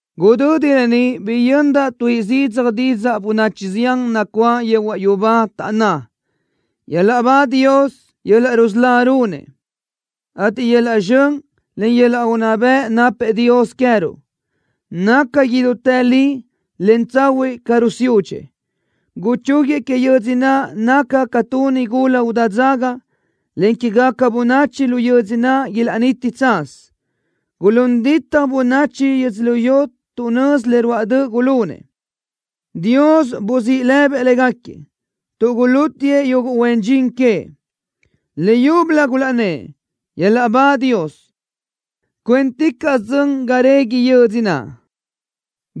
Gudödi lë ni biyöndaʼ tuíʼi zidzaj didzaʼ bönachi zián nacuáʼ yehuaʼ yubá, taʼnná: ¡Yöl-laʼ ba Dios! ¡Yöl-laʼ rusölá runëʼ, ateʼ yöl-laʼ zxön, en yöl-laʼ unná bëʼ napëʼ Dios queë́ruʼ! ¡Naca idútë li, en tsahuiʼ ca rusiúdxëʼ! ¡Guchúguiëʼ que yödzö naʼ naca ca tu nigula udá dzaga, en quégaca bönachi lu yödzö naʼ ilaʼniti tsaz! ¡Gulún ditaj bönachi yödzölió tuʼ nözi le ruáʼ döʼ gulunëʼ! ¡Dios buzíʼ lëbëʼ légaquiëʼ tuʼ gulútiëʼ yuguʼ huen dxin queëʼ! Leyúbölö gulaʼnnë́ʼ: “¡Yöl-laʼ ba Dios! ¡Cuénticaʼsö dzön ga régui yödzö naʼ!”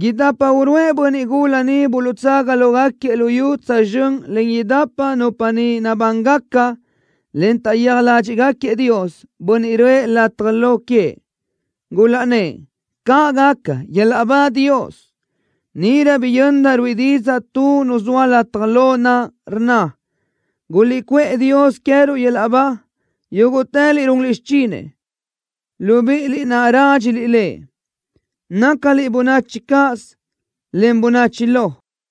Idapa uruʼë bönniʼ gula niʼ buluʼtsaga lógaquiëʼ lu yu tsözxö́n len idapa nupa niʼ nabángaca, en taʼyéaj ládxiʼgaquiëʼ Dios, Bönniʼ röʼë lataj lo queëʼ. Gulaʼnnë́ʼ: “¡Caʼ gaca! ¡Yöl-laʼ ba Dios!” Níʼirö biyöndaʼ ruíʼi didzaʼ tu nu zoa lataj lo naʼ, rnna: ¡Guliʼcuʼë Dios queë́ruʼ yöl-laʼ ba yúguʼtëliʼ runliʼ xichinëʼ, libíʼiliʼ naʼ rádxiliʼ Lëʼ, nácaliʼ bönachi cáʼasö, en bönachi lo!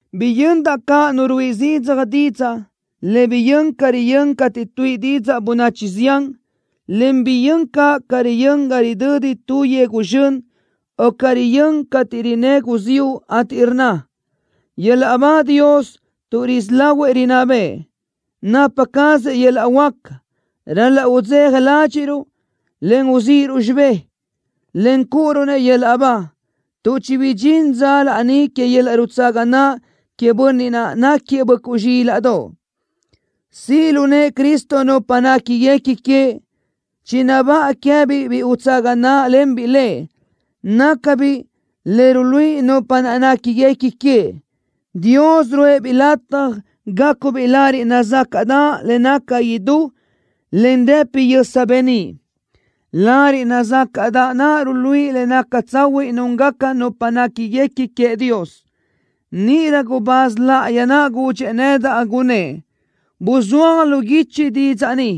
Biyöndaʼ caʼ nu ruíʼi zidzaj didzaʼ, le biyö́n ca riyö́n cateʼ tuíʼi didzaʼ bönachi zián, en biyö́n caʼ ca riyö́n ga ridödi tu yegu zxön, o ca riyö́n cateʼ rinnë́ guziúʼ, ateʼ rnna: ¡Yöl-laʼ ba Dios tuʼ risí lahuëʼ rinná bëʼë! ¡Napa cazëʼ yöl-laʼ huáca! ¡Ral-laʼ udzeja ládxiʼruʼ, en uzíʼiruʼ xibë́ʼ, en cúʼuruʼ-nëʼ yöl-laʼ ba tuʼ chibidxín dza laní que yöl-laʼ rutsaga naʼ queëʼ Bönniʼ naʼ náquiëʼ Böʼcuʼ Zxílaʼdoʼ! ¡Siʼ lu nëʼë Cristo nupa néquiguequi queëʼ! ¡Chinabáʼa queë́biʼ biʼi utsaga náʼalenbiʼ Lëʼ! ¡Nácabiʼ le ruluíʼi nupa naʼ néquiguequi queëʼ! ¡Dios ruʼë-biʼ lataj gácubiʼ lariʼ nazácaʼdaʼ le naca idú, en rëpi yösa beníʼ! Lariʼ nazácaʼdaʼ naʼ ruluíʼi le naca tsahuiʼ núngaca nupa néquiguequi queëʼ Dios. Níʼirö gubáz láʼayi naʼ gudxëʼ nedaʼ, gunnë́ʼ: “Buzúaj lu guichi didzaʼ ni: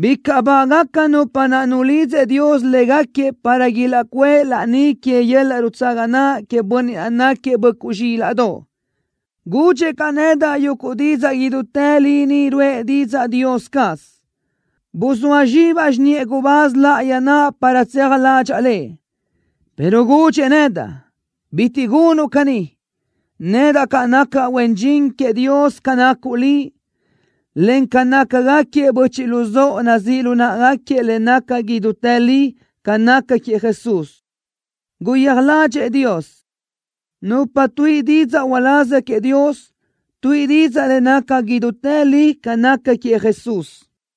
¡Bicaʼ bágaca nupa naʼ nulidzëʼ Dios légaquiëʼ para ilaʼcuʼë laní que yöl-laʼ rutsaga naʼ queëʼ Bönniʼ náquiëʼ Böʼcuʼ Zxílaʼdoʼ!” Gudxëʼ caʼ nedaʼ: “¡Yuguʼ didzaʼ idútë li ni ruʼë didzaʼ Dios caz!” Buzóa zxibaʼ xiniʼë gubáz láʼayi naʼ para tseaj ládxaʼa lëʼ, pero gudxëʼ nedaʼ: “¡Bitiʼ gunuʼ caní! Nedaʼ caʼ nacaʼ huen dxin queëʼ Dios ca nacuʼ liʼ, en ca nácagaquiëʼ böchiʼ luzóʼo nazíʼ lu náʼagaquiëʼ le naca idútë li ca naca queëʼ Jesús. ¡Guyéaj ládxëʼë Dios!” Nupa tuíʼi didzaʼ uláz queëʼ Dios, tuíʼi didzaʼ le naca idútë li ca naca queëʼ Jesús.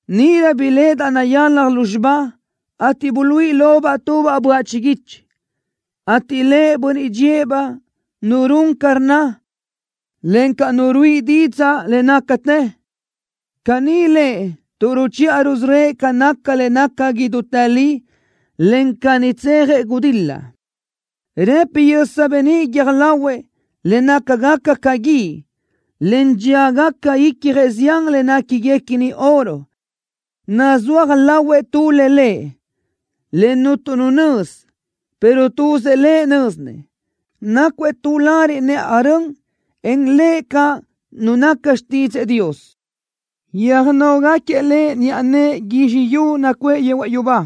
Níʼirö biléʼedaʼ nayalaj lúzxiba, ateʼ buluíʼi lobaʼ tubaʼ böaʼ chiguichi, ateʼ lëʼ Bönniʼ dxíëʼ-baʼ, Nu Run Ca Rnna, encaʼ Nu Ruíʼi Didzaʼ Le Nácatë. Caní lëʼ tuʼ ruchiʼa rusörö́ëʼ ca naca le naca idútë li, encaʼ caní tsejëʼ gudil-la. Rëpi yösa beníʼ guiö́j lahuëʼ, le nácagaca ca guíʼ, en dxíagaca icjëʼ zián le néquiguequini oro. Nazúaj lahuëʼ tu le lëʼ, le cuntu nu nözi, pero tuzëʼ Lëʼ nö́zinëʼ. Nácuëʼ tu lariʼ nëʼaj rön, en lëʼ caʼ “Nu Naca Xtídzëʼë Dios.” Röjnógaquiëʼ Lëʼ niʼa nëʼë guizxi yu nacuʼë yehuaʼ yubá,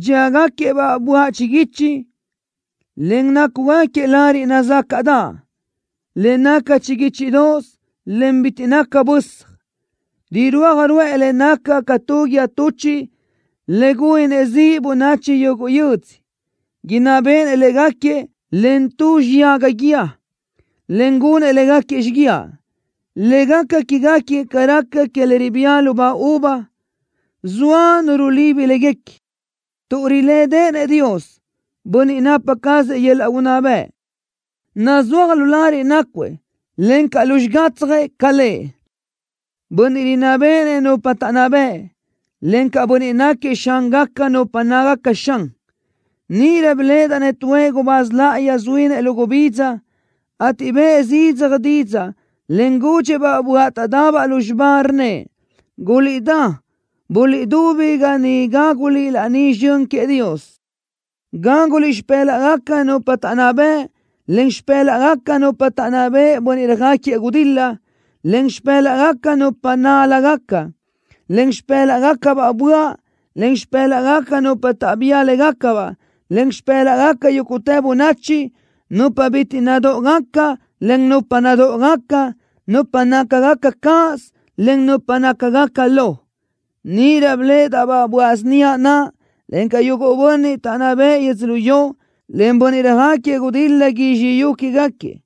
dxíagaquiëʼ-baʼ böaʼ chiguichi, en nácugaquiëʼ lariʼ nazácaʼdaʼ, le naca chiguíchidoʼos, en bitiʼ naca bösaj. Rirúaj ruʼë le naca ca tu guíë tuchiʼ le gúninëʼ ziʼ bönachi yuguʼ yödzö. Inná béʼenëʼ légaquiëʼ len tu xiyaga guíë, en gunëʼ légaquiëʼ xíguiaʼ, le gaca quégaquiëʼ ca raca que le ribía lubá uva, zoa nu rulibi léguequi, tuʼ rilédeʼenëʼ Dios, Bönniʼ napa cazëʼ yöl-laʼ unná bëʼ. Nazúaj lu lariʼ nácuëʼ, encaʼ lu xigatsjëʼ ca lëʼ, “Bönniʼ Rinná Béʼenëʼ Nupa Taʼnná Bëʼ”, encaʼ “Bönniʼ Náquiëʼ Xángaca Nupa Nácagaca Xan.” Níʼirö biléʼedaʼ-nëʼ tuëʼ gubáz láʼayi zuínëʼ lu gubidza, ateʼ bëʼë zidzaj didzaʼ, en gudxëʼ-baʼ böaʼ taʼdabaʼ lúzxiba, rnnëʼ: “¡Guliʼdá, buliʼdubi ga ni gáguliʼ laní zxön queëʼ Dios! Gáguliʼ xipë́laʼgaca nupa taʼnná bëʼ, en xipë́laʼgaca nupa taʼnná beʼe bönniʼ röjáquiëʼ gudil-la, en xipë́laʼgaca nupa nál-lagaca, en xipë́laʼgacabaʼ böaʼ, en xipë́laʼgaca nupa taʼbía légacabaʼ, en xipë́laʼgaca yúguʼtë bönachi, nupa bitiʼ nadóʼogaca, en nupa nadóʼogaca, nupa nácagaca cáʼasö, en nupa nácagaca lo.” Níʼirö biléʼedaʼ-baʼ böaʼ síniaʼ naʼ, encaʼ yuguʼ bönniʼ taʼnná bëʼë yödzölió, en bönniʼ röjáquiëʼ gudil-la guizxi yu quégaquiëʼ,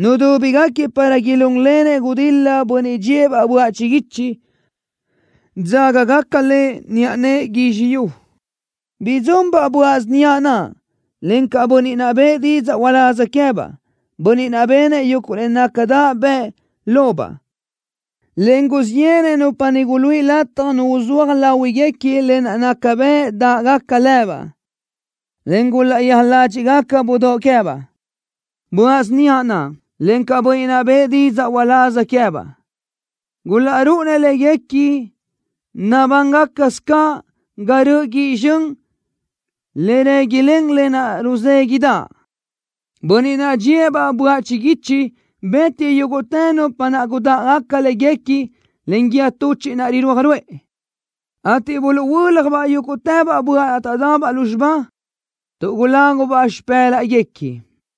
nudúbigaquiëʼ para ilúnlenëʼ gudil-la Bönniʼ dxíëʼ-baʼ böaʼ chiguichi, dzágagaca Lëʼ niʼa nëʼë guizxi yu. Bidzunbaʼ böaʼ síniaʼ naʼ, encaʼ bönniʼ naʼ bëʼë didzaʼ uláz queë́baʼ, bönniʼ naʼ benëʼ yuguʼ le nácadaʼ bëʼ lobaʼ, en guzxíʼ yéʼenëʼ nupa niʼ guluíʼi lataj nu uzúaj láhuiguequi lë naʼ naca bëʼ dáʼgaca lëbaʼ, en gulaʼyéaj ládxiʼgaca budóʼ queë́baʼ. Böaʼ síniaʼ naʼ, encaʼ bönniʼ naʼ bëʼë didzaʼ uláz queë́baʼ, gulaʼrúʼunëʼ léguequi nabángacasö caʼ ga röʼö guíʼ zxön le réguilen lë naʼ ruzéguiʼdaʼ. Bönniʼ naʼ dxíëʼ-baʼ böaʼ chiguích bë́tiëʼ yúguʼtë nupa naʼ gudáʼgaca léguequi len guíë tuchiʼ naʼ rirúaj ruʼë, ateʼ buluʼhuö́ljabaʼ yúguʼtëbaʼ böaʼ naʼ taʼdabaʼ lúzxiba, tuʼ gulágubaʼ xipë́laʼguequi.